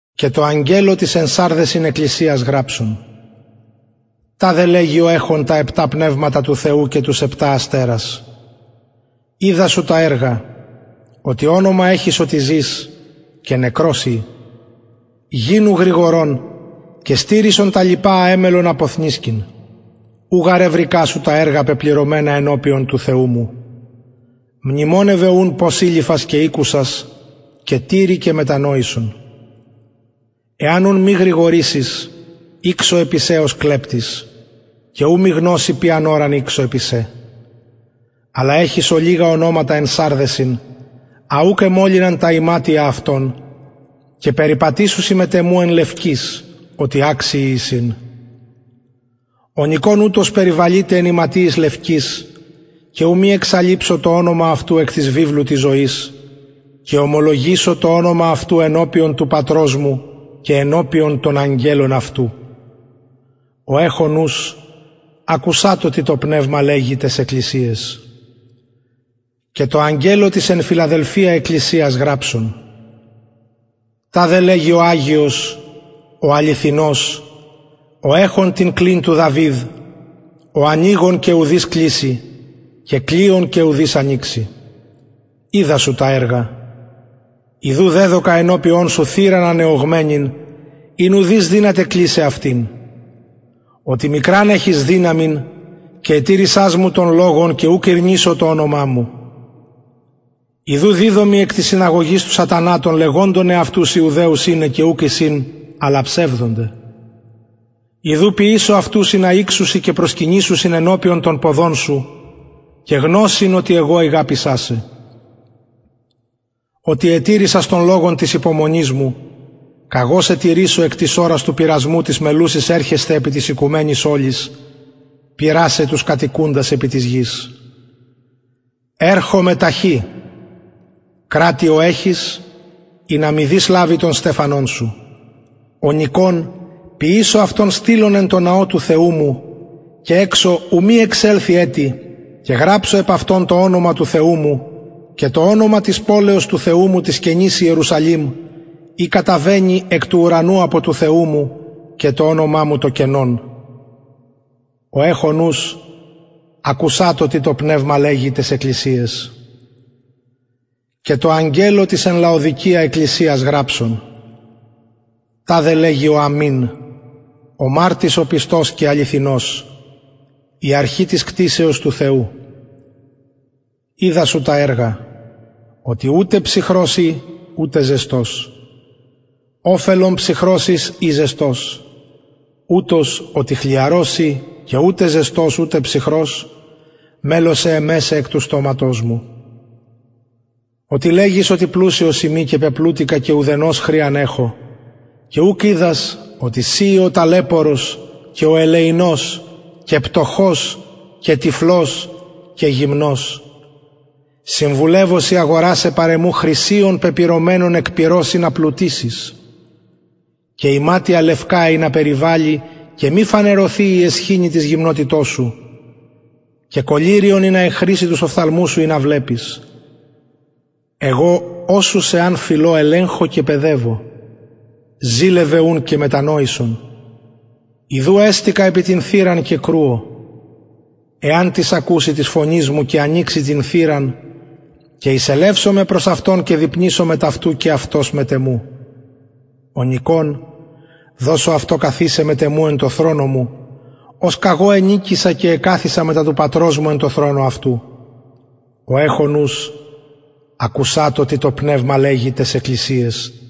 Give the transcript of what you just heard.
και τω αγγελω της εν σαρδεσιν εκκλησιας γραψον ταδε λεγει ο εχων τα επτα πνευματα του θεου και τους επτα αστερας οιδα σου τα εργα οτι ονομα εχεις οτι ζης και νεκρος ει γινου γρηγορων και στηρισον τα λοιπα α εμελλες αποβαλλειν ου γαρ ευρηκα σου τα εργα πεπληρωμενα ενωπιον του θεου μου μνημονευε ουν πως ειληφας και ηκουσας και τηρει και μετανοησον εαν ουν μη γρηγορησης ηξω επι σε ως κλεπτης και ου μη γνως ποιαν ωραν ηξω επι σε αλλ ολιγα εχεις ονοματα εν σαρδεσιν α ουκ εμολυναν τα ιματια αυτων και περιπατησουσιν μετ εμου εν λευκοις οτι αξιοι εισιν ο νικων ουτος περιβαλειται εν ιματιοις λευκοις και ου μη εξαλειψω το ονομα αυτου εκ της βιβλου της ζωης και ομολογησω το ονομα αυτου ενωπιον του πατρος μου και ενωπιον των αγγελων αυτου ο εχων ους ακουσατω τι το πνευμα λεγει ταις εκκλησιαις και τω αγγελω της εν φιλαδελφεια εκκλησιας γραψον ταδε λεγει ο αγιος ο αληθινος ο εχων την κλειν του δαυιδ ο ανοιγων και ουδεις κλεισει αυτην ει μη ο ανοιγων και ουδεις ανοιξει οιδα σου τα εργα ιδου δεδωκα ενωπιον σου θυραν ανεωγμενην ην ουδεις δυναται κλεισαι αυτην οτι μικραν εχεις δυναμιν και ετηρησας μου τον λογον και ουκ ηρνησω το ονομα μου ιδου διδωμι εκ της συναγωγης του σατανα των λεγοντων εαυτους ιουδαιους ειναι και ουκ εισιν αλλα ψευδονται ιδου ποιησω αυτους ινα ηξωσιν και προσκυνησωσιν ενωπιον των ποδων σου και γνωσιν οτι ηγαπησα σε οτι ετηρησας τον λογον της υπομονης μου καγω σε τηρησω εκ της ωρας του πειρασμου της μελλουσης ερχεσθαι επι της οικουμενης ολης πειρασαι τους κατοικουντας επι της γης ερχομαι ταχυ κρατει ο εχεις ινα μηδεις λαβη τον στεφανον σου ο νικων ποιησω αυτον στυλον εν τω ναω του θεου μου και εξω ου μη εξελθη ετι και γραψω επ αυτον το ονομα του θεου μου και το ονομα της πολεως του θεου μου της καινης ιερουσαλημ η καταβαινει εκ του ουρανου απο του θεου μου και το ονομα μου το καινον ο εχων ους ακουσατω τι το πνευμα λεγει ταις εκκλησιαις και τω αγγελω της εν λαοδικεια εκκλησιας γραψον ταδε λεγει ο αμην ο μαρτυς ο πιστος και αληθινος η αρχη της κτισεως του θεου οιδα σου τα εργα οτι ουτε ψυχρος ει ουτε ζεστος οφελον ψυχρος ης η ζεστος ουτως οτι χλιαρος ει και ου ζεστος ουτε ψυχρος μελλω σε εμεσαι εκ του στοματος μου οτι λεγεις πλουσιος ειμι και πεπλουτηκα και ουδενος χρειαν εχω και ουκ οιδας οτι συ ει ο ταλαιπωρος και ο ελεεινος και πτωχος και τυφλος και γυμνος συμβουλευω σοι αγορασαι χρυσιον παρ εμου πεπυρωμενον εκ πυρος ινα πλουτησης και ιματια λευκα ινα περιβαλη και μη φανερωθη η αισχυνη της γυμνοτητος σου και κολλυριον ινα εγχριση τους οφθαλμους σου ινα βλεπης εγω οσους εαν φιλω ελεγχω και παιδευω ζηλωσον ουν και μετανοησον ιδου εστηκα επι την θυραν και κρουω εαν τις ακουση της φωνης μου και ανοιξη την θυραν και εισελευσομαι προς αυτον και δειπνησω μετ αυτου και αυτος μετ εμου ο νικων δωσω αυτω καθισαι μετ εμου εν τω θρονω μου ως καγω ενικησα και εκαθισα μετα του πατρος μου εν τω θρονω αυτου ο εχων ους ακουσατω τι το πνευμα λεγει ταις εκκλησιαις